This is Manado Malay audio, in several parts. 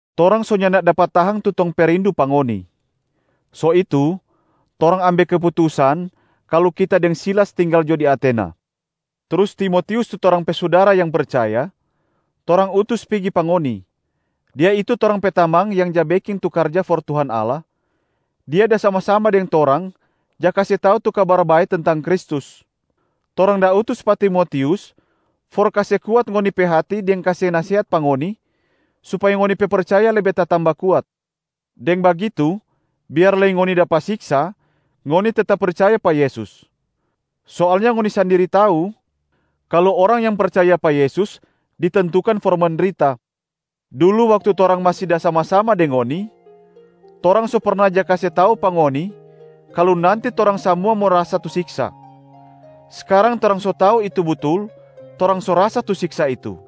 Torang so nyanda dapa tahang tu tong pe rindu pa ngoni. So itu, torang ambe keputusan kalu kita deng Silas tinggal jo di Atena, trus Timotius tu torang pe sudara yang percaya, torang utus pigi pa ngoni. Dia itu torang pe tamang yang ja beking tu karja for Tuhan Allah, dia da sama-sama deng torang ja kase tau tu Kabar Bae tentang Kristus. Torang da utus pa Timotius for kase kuat ngoni pe hati deng kase nasehat pa ngoni supaya ngoni pe percaya lebe tatamba kuat. Deng bagitu, biar lei ngoni dapa siksa, ngoni tetap percaya pa Yesus. Soalnya ngoni sandiri tau kalu orang yang percaya pa Yesus ditentukan for mendrita. Dulu waktu torang masi da sama-sama deng ngoni, torang so perna ja kase tau pa ngoni kalu nanti torang samua mo rasa tu siksa. Skarang torang so tau itu butul, torang so rasa tu siksa itu.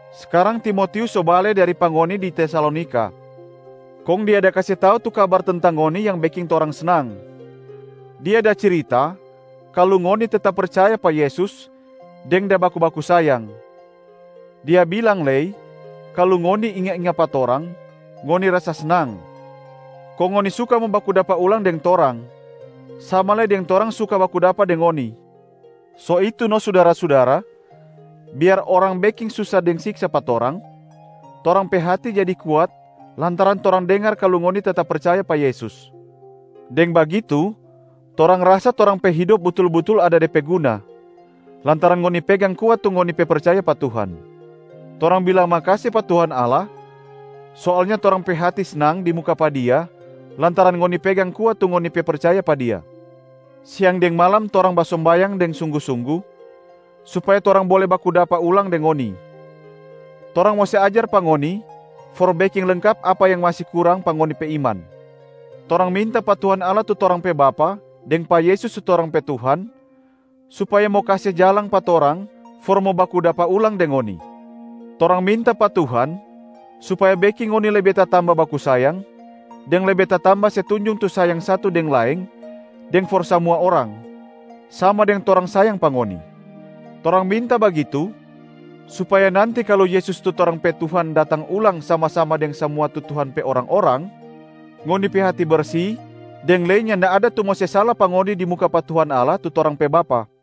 Skarang Timotius so bale dari pa ngoni di Tesalonika, kong dia da kase tau tu kabar tentang ngoni yang beking torang snang. Dia da cirita kalu ngoni tetap percaya pa Yesus deng da baku-baku sayang. Dia bilang lei kalu ngoni inga-inga pa torang, ngoni rasa snang. Kong ngoni suka mo baku dapa ulang deng torang, sama lei deng torang suka baku dapa deng ngoni. So itu no sudara-sudara, biar orang beking susa deng siksa pa torang, torang pe hati jadi kuat lantaran torang dengar kalu ngoni tetap percaya pa Yesus. Deng bagitu torang rasa torang pe hidop butul-butul ada de pe guna, lantaran ngoni pegang kuat tu ngoni pe percaya pa Tuhan. Torang bilang makase pa Tuhan Allah, soalnya torang pe hati snang di muka pa Dia lantaran ngoni pegang kuat tu ngoni pe percaya pa Dia. Siang deng malam torang basombayang deng sunggu-sunggu supaya torang bole baku dapa ulang deng ngoni. Torang mo se ajar pa ngoni for beking lengkap apa yang masi kurang pa ngoni pe iman. Torang minta pa Tuhan Allah tu torang pe Bapa, deng pa Yesus tu torang pe Tuhan supaya mo kase jalang pa torang for mo baku dapa ulang deng ngoni. Torang minta pa Tuhan supaya beking ngoni lebe tatamba baku sayang, deng lebe tatamba se tunjung tu sayang satu deng laeng deng for samua orang, sama deng torang sayang pa ngoni. Torang minta bagitu supaya nanti kalu Yesus tu torang pe Tuhan datang ulang sama-sama deng samua tu Tuhan pe orang-orang, ngoni pe hati bersi deng lei nyanda ada tu mo se sala pa ngoni di muka pa Tuhan Allah tu torang pe Bapa.